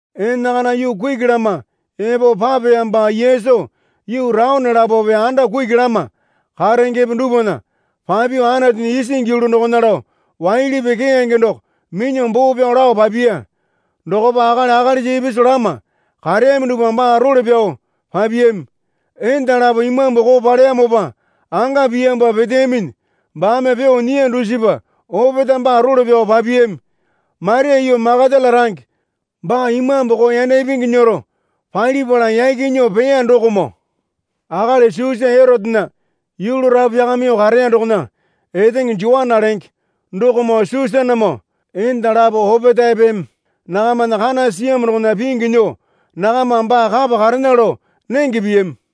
Enakana yuu kuki lama epo papeyamopa Yesu yuu taone lapope anda kuki lama karengepe dupwana papyuo Anatunya isingi yulu dokona lao waili pii keyange doko minyuo boo pyao lao papiya. Dokopa akali akalisa ipisu lama kareyami dupwa baa role pyao papiyami. Enda lapo imambu koo paleyamopa anga piyamopa peteyaminyi baame pyuo nyiya dusipa opetae baa role pyao papiyami. Maria yuu Makatala range baa imambu koo yanda ipingi nyero palipala yaki nyuo peya dokomoo akali Susa Erotena yulu rapu pyakamyuo kareya dokona etenge Joana lenge dokomoo Susanamoo enda lapo opetaepeme nakamana kana siyamo dokona pingyu nyuo nakamame baa kapa karena lao nenge piyami.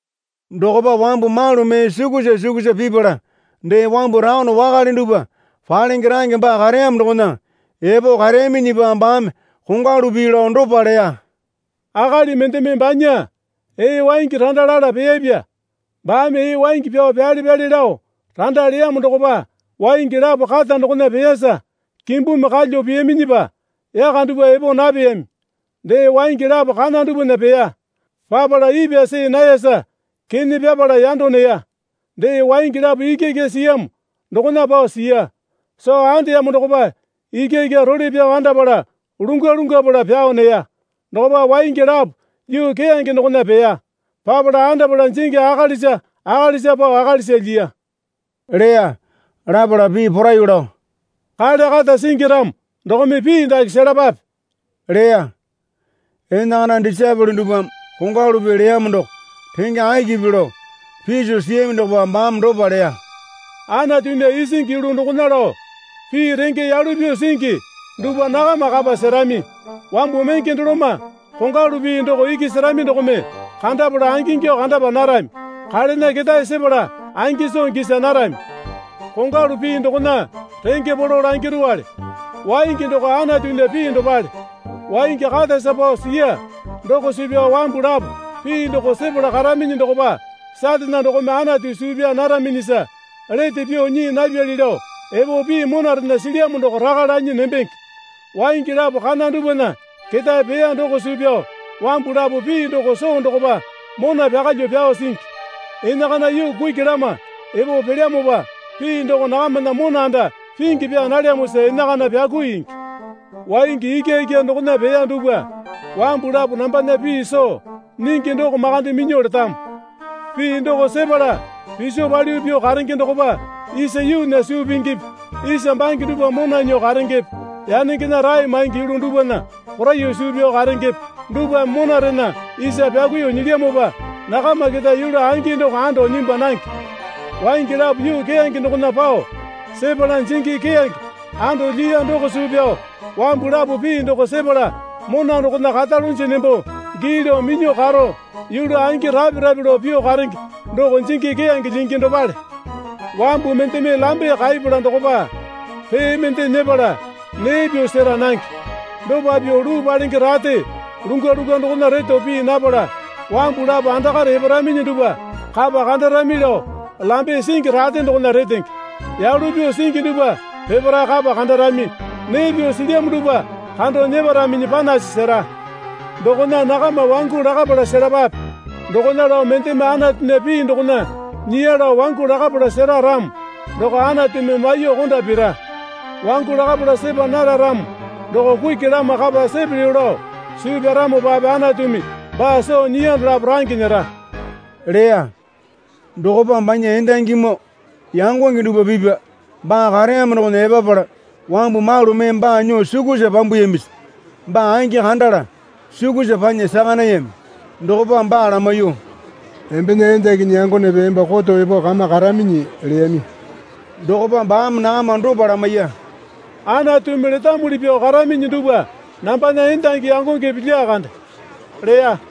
Dokopa wambu malu mee sukusa sukusa pipala dee wambu taone wakale dupwa palenge range baa kareyamo dokona epo kareyaminyipa baame kongwalu pii lao dopa leya. Akali mendeme banya ee waingi randa lala peyapya. Baame ee waingi pyao pyale pyale lao randa leyamo dokopa waingi lapo kata dokona peyasa kimbumi kalyuo peyaminyipa yaka dupwa epo napeyami. Dee waingi lapo kana dupwana peya. Papala ipwa see nayasa kene pyapala yando neya. Dee waingi lapo ikyaikya siyamo dokona pao siya. Soo andeyamo dokopa ikyaikya role pyao andapala lungwa lungwapala pyao neya. Dokopa waingi lapo yuu keyange dokona peya. Papala andapala jingi akalisa akalisa pao akalisa lyiya, leya. Lapala pii poraiyuo lao, Kale kata singi ramo dokome pii dake selapape leya. Enakana disaepole dupwame kongwalu pii leyamo doko renge akipi lao piso siyami dokopa baame dopa leya. Anatunya isingi yulu dokona lao pii renge yalu pyuo singi dupwa nakama kapa serami. Wambu menge doloma kongwalu pii doko iki serami dokome kandapala angingyuo kandapa narami, kalena ketae sepala angi soo gisa narami. Kongwalu pii dokona renge polo langirowale. Waingi doko Anatunya pii dopale. Waingi katasa pao siya doko suu pyao wambu lapo pii doko sepala karaminyi dokopa Satane dokome Anatu suu pyaa naraminyisa lete pyuo nyii napyali lao epo pii monarena silyamo doko raka lanyi nembenge. Waingi lapo kana dupwana ketae peya doko suu pyao wambu lapo pii doko soo dokopa mona pyakalyuo pyao singi. Enakana yuu kuki lama epo pelyamopa pii doko nakamana mona anda pingi pyaa nalyamosa enakana pyakuingi. Waingi ikyaikya dokona peya dupwa wambu lapo nambana pii soo nyingi doko makande minyuo letamo. Pii doko sepala piso palyuo pyuo karenge dokopa isa yuunya suu pingipi isa bange dupwa mona nyuo karengepe yanengena rae maingi yulu dupwana poraiyuo suu pyao karengepe dupwame monarena isa pyakuiyuo nyilyamopa nakama keta yulu angi doko ando nyimbwa nange. Waingi lapo yuu keyange dokona pao sepala jingi keyange anda lyiya doko suu pyao wambu lapo pii doko sepala mona dokona karalunji nembo gii lao minyuo karo yulu angi rape rape lao pyuo karenge doko jingi keyange lyingi dopale. Wambu mendeme lambe kaipala dokopa pee mende nyepala nee pyuo sera nange. Dopa pyuo luu palenge rate lungwa lungwa dokona reto pii napala wambu lapo andakare eparaminyi dupwa kapa kandarami lao lambe singi rate dokona retenge. Yalu pyuo singi dupwa peparae kapa kandarami. Nee pyuo silyamo dupwa kando nyeparaminyi panasi sera. Dokona nakama wangu lakapala selapape. Dokona lao mendeme Anatunya pii dokona nyiya lao wangu lakapala sera ramo doko Anatumi maiyuo konda pira. Wangu lakapala sepa nara ramo doko kuki lama kapa sepelyo lao suu pyaramopape Anatumi baa soo nyiya dolapo range nyera, leya. Dokopa banya endangimoo yangonge dupwa pipya baa kareyamo dokona epapala wambu malu mee baa nyuo sukusa pyambuyamisa baa angi kandala sukusa panya saka nayami. Dokopa baa lamaiyuo, Embena endakinyi yangonepe emba koto epo kama karaminyi leyami. Dokopa baame nakama dopa lamaiya. Anatumi letamuli pyuo karaminyi dupwa nambana endangi yangongepe lyakande leya.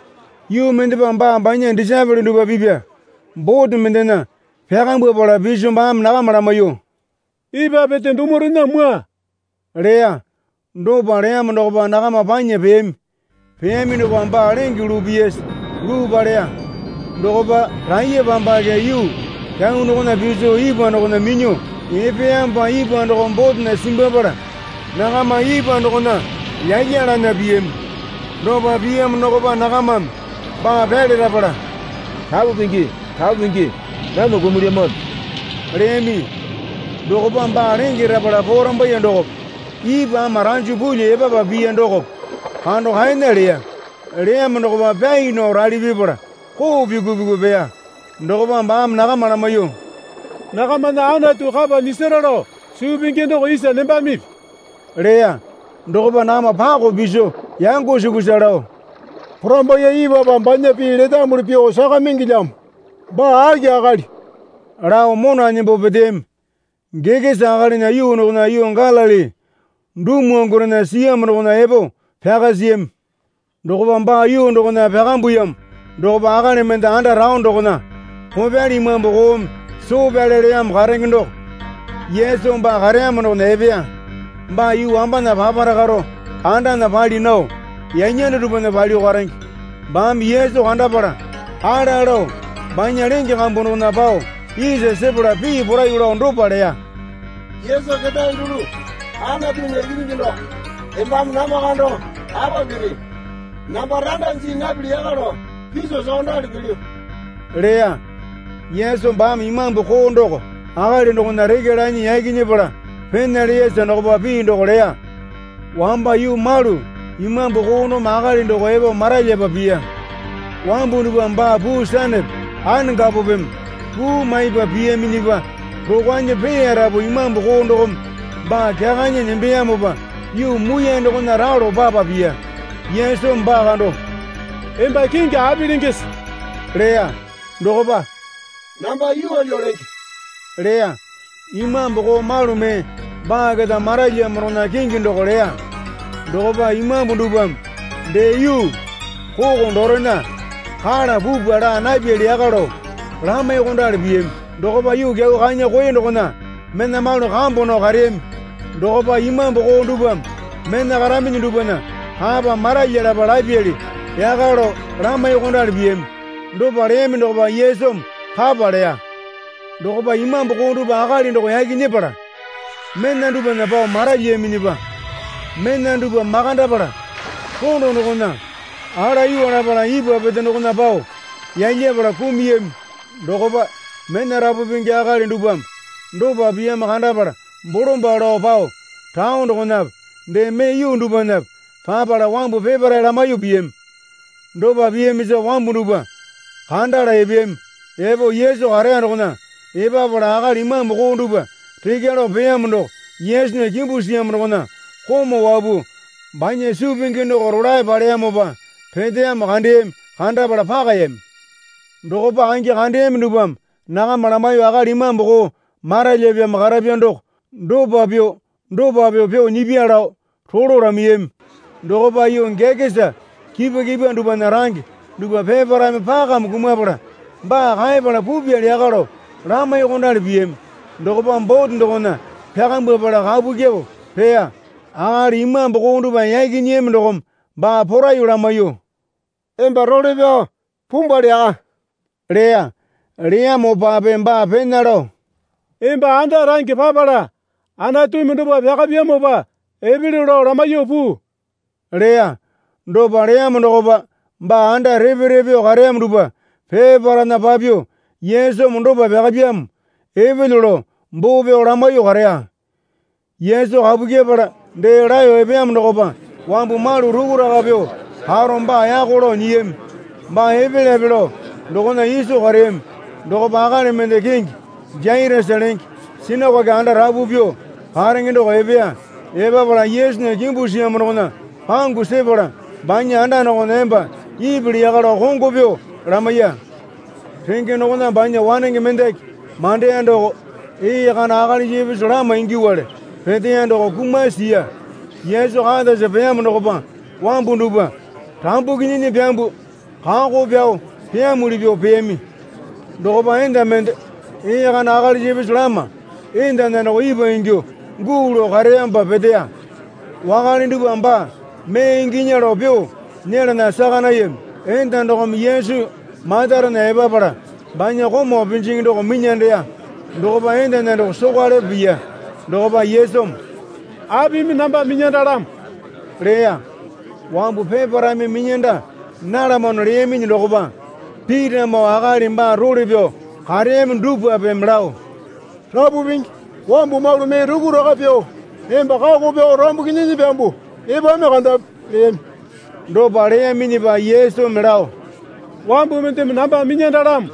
Yuu mendepa baa banya disaepole dupwa pipya bote mendena pyakambwapala piso baame nakama lamaiyuo, Ipwa pete dumurena mwua leya. Dopa leyamo dokopa nakama panya peyami. Peyami dokopa baa lenge luu piyasa luu paleya. Dokopa raiyapambake yuu kyau dokona piso ipwa dokona minyuo epeyamopa ipwa dokome botena simbwapala nakama ipwa dokona yalyalana piyami. Dopa piyamo dokopa nakamame baa pyalerapala, Rapu Pingi, Rapu Pingi, namwa kumulyamano leyami. Dokopa baa lenge rapala porambaiye dokope ipwa ama ranjo pulyuo epapa piya dokope kando kaena leya. Leyamo dokopa pyai nao rali pipala koo pyuku pyuku peya. Dokopa baame nakama lamaiyuo, Nakamana Anatu kapa nyisara lao suu pingi doko isa nembamipi? leya. Dokopa nakama pakao piso yango sukusa lao, Porambaiye ipwapa banya pii letamuli pyuo sakamingilyamo. Baa aki akali? lao mona nembo peteyami. Gekesa akalinya yuu dokona yuu Galili dumwangurena siyamo dokona epo pyaka siyami. Dokopa baa yuu dokona pyakambuyamo dokopa akali mende anda taone dokona kopyali imambu koome soo pyale leyamo karenge doko Yesu baa kareyamo dokona epeya. Baa yuu wambana papara karo andana pali nao yanyanda dupwana palyuo karenge. Baame Yesu kandapala ala lao banya lenge kambu dokona pao isa sepala pii poraiyuo lao dopa leya. Yesu ketae dulu Anatunya Ikinyingi doko embame namba kando apa piri. Namba randa jii napili yaka lao piso sokondali pilyu? leya. Yesu baame imambu koo doko akali dokona rekya lanyi yaki nyepala pena leyasa dokopa pii doko leya. Wamba yuu malu imambu koo dokome akali doko epo maralyapa piya. Wambu dupwame baa puu sanepe anakapopeme puu maipa piyaminyipa rokwanyi peyarapu imambu koo dokome baa kyakanyi nembeyamopa yuu muiyane dokona ralo papa piya. Yesumi baa kando, Emba kingi api lengese? leya. Dokopa, Namba Yuwalyu lenge, leya. Imambu koo malu mee baa keta maralyiyamo dokona kingi doko leya. Dokopa imambu dupwame dee yuu koko dorena kala pupwa laa napyali yaka lao lamaiyuokondali piyami. Dokopa yuu kyau kanya koe dokona mena malu kambu nao kareyami. Dokopa imambu koo dupwame mena karaminyi dupwana kapa maralyalapa lapyali yaka lao lamaiyuokondali piyami. Dopa leyami dokopa Yesumi kapa leya. Dokopa imambu koo dupwa akali doko yaki nyepala mena dupwana pao maralyiyaminyipa mena dupwa makandapala rondo dokona alayuwa lapala ipwa pete dokona pao yalyapala kumuyami. Dokopa mena rapu pingi akali dupwame dopa piyamo kandapala bolombalo lao pao taone dokonape dee mee yuu dupwanape papala wambu peparae lamaiyuo piyami. Dopa piyamisa wambu dupwa kandala epeyami. Epo Yesu kareya dokona epapala akali imambu koo dupwa rekya lao peyamo doko Yesunya kimbu siyamo dokona komau wapuo banya suu pingi doko rolae paleyamopa peteyamo kandeyami. Kandapala pakayami. Dokopa angi kandeyami dupwame nakama lamaiyuo akali imambu koo maralyipyamo karapya doko dopa pyuo dopa pyuo pyuo nyipya lao rolo lamaiyami. Dokopa yuu Gekesa kipwa kipwa dupwana range dupwa peparaeme pakame kumapala baa kaepala pupyali yaka lao lamaiyuokondali piyami. Dokopa bote dokona pyakambwapala kapu kyuo peya. Akali imambu koo dupwa yaki nyiyami dokome baa poraiyuo lamaiyuo, Emba role pyao pumbwali yaka leya. Leyamopape baa pena lao, Emba anda range papala Anatumi dopa pyakapyamopa epelyo lao lamaiyuo puu, leya. Dopa leyamo dokopa baa anda repe repe pyuo kareyamo dupwa peparaena papyuo, Yesumi dopa pyakapyamo epelyo, lao boo pyao lamaiyuo kareya. Yesu kapu kyepala dee laeyo epeyamo dokopa wambu malu rukuraka pyuo karo baa yako lao nyiyami. Baa epelyape lao dokona iso kareyami. Dokopa akali mende kingi Jairasa lenge sinakoke anda rapu pyuo karenge doko epeya. Epapala Yesunya kimbu siyamo dokona pangu sepala banya anda dokona emba ipili yaka lao kongo pyuo lamaiya. Renge dokona banya wanenge mendaki mandeya doko ee kana akalisa ipisu lama ingyuowale peteya doko kumasi siya. Yesu katasa peyamo dokopa wambu dupwa rambuki nyinyi pyambuo kako pyao peyamuli pyuo peyami. Dokopa enda mende ee kana akalisa ipisu lama endana doko ipwa ingyuo guu lao kareyamopa peteya. Wakale dupwame baa mee inginya lao pyuo nyelana saka nayami. Enda dokome Yesu matarena epapala banya komau pinjingi doko minyandeya. Dokopa endana doko sokwalepo piya. Dokopa Yesumi, Apimi namba minyandalamo? leya. Wambu peparaeme minyanda nalamano leyaminyi dokopa Pitamoo akali baa role pyao kareyami dupwapeme lao, Rapu Pingi, wambu malu mee rukuraka pyuo emba kako pyao rambuki nyinyi pyambuo epami kandapi leyami. Dopa leyaminyipa Yesumi lao, Wambu mendeme namba minyandalamo.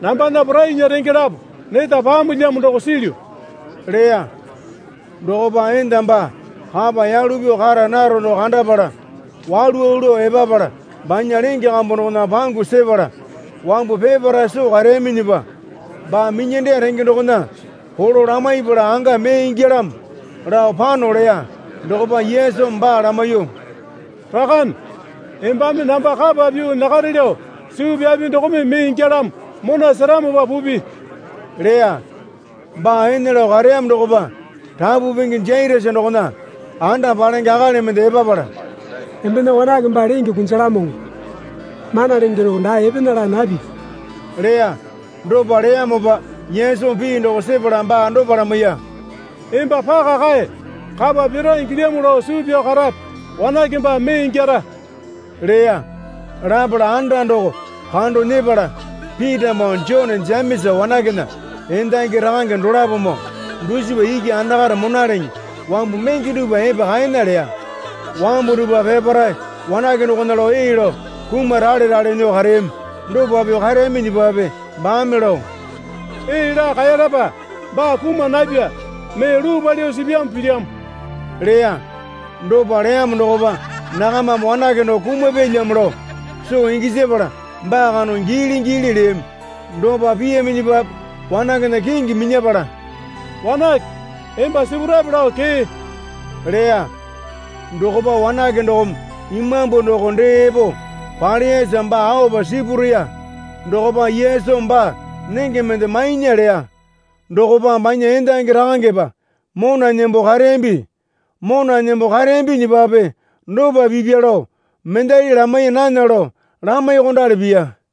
Nambana porainya renge lapo neta paamolyamo doko silyu leya. Dokopa enda baa kapa yalu pyuo kara naro doko kandapala walu walu lao epapala banya lenge kambu dokona pangu sepala wambu peparae soo kareyaminyipa, baa minyandeya renge dokona polo lamaipala anga mee ingyalamo lao pano leya. Dokopa Yesumi baa lamaiyuo, Rakane, embame namba kapa pyuo nyakare lao suu pyapi dokome mee ingyalamo. Mona seramopa pupi, leya. Baa ene lao kareyamo dokopa rapu pingi Jairasa dokona anda palenge akali mende epapala, Embena wanake baa lenge kunjalamoŋo. Mana Lenge doko dae epena laa napipi leya. Dopa leyamopa Yesumi pii doko sepala baa dopa lamaiya. Emba paka kae. Kapa pira ingilyamo lao suu pyao karape. Wanake baa mee ingyara, leya. Lapala anda doko kando nyepala Pitamoo Jone Jemesa wanakena endangi rakange dolapomoo dusipa iki andakare monaleŋe wambu menge dupwa epa kaena leya. Wambu dupwa peparae wanake dokona lao ee lao kumaralerale nyuo kareyami. Dopa pyuo kareyaminyipape baame lao, Ee laa kaeyalapa. Baa kuma napya. Mee luu palyuo sipyamo pilyamo, leya. Dopa leyamo dokopa nakamame wanake doko kumapyalyamo lao soo gisapala baa kando giili giili leyami. Dopa piyaminyipape wanakena kingi minyapala, Wanake, emba sipurape lao kee leya. Dokopa wanake dokome imambu doko dee epo paleyasa baa aopa sipureya. Dokopa Yesumi baa nenge mende mainya leya. Dokopa banya endangi rakangepa mona nembo kareyambi. Mona nembo kareyambinyipape dopa pipya lao mendali lamaiya nana lao lamaiyuokondali piya.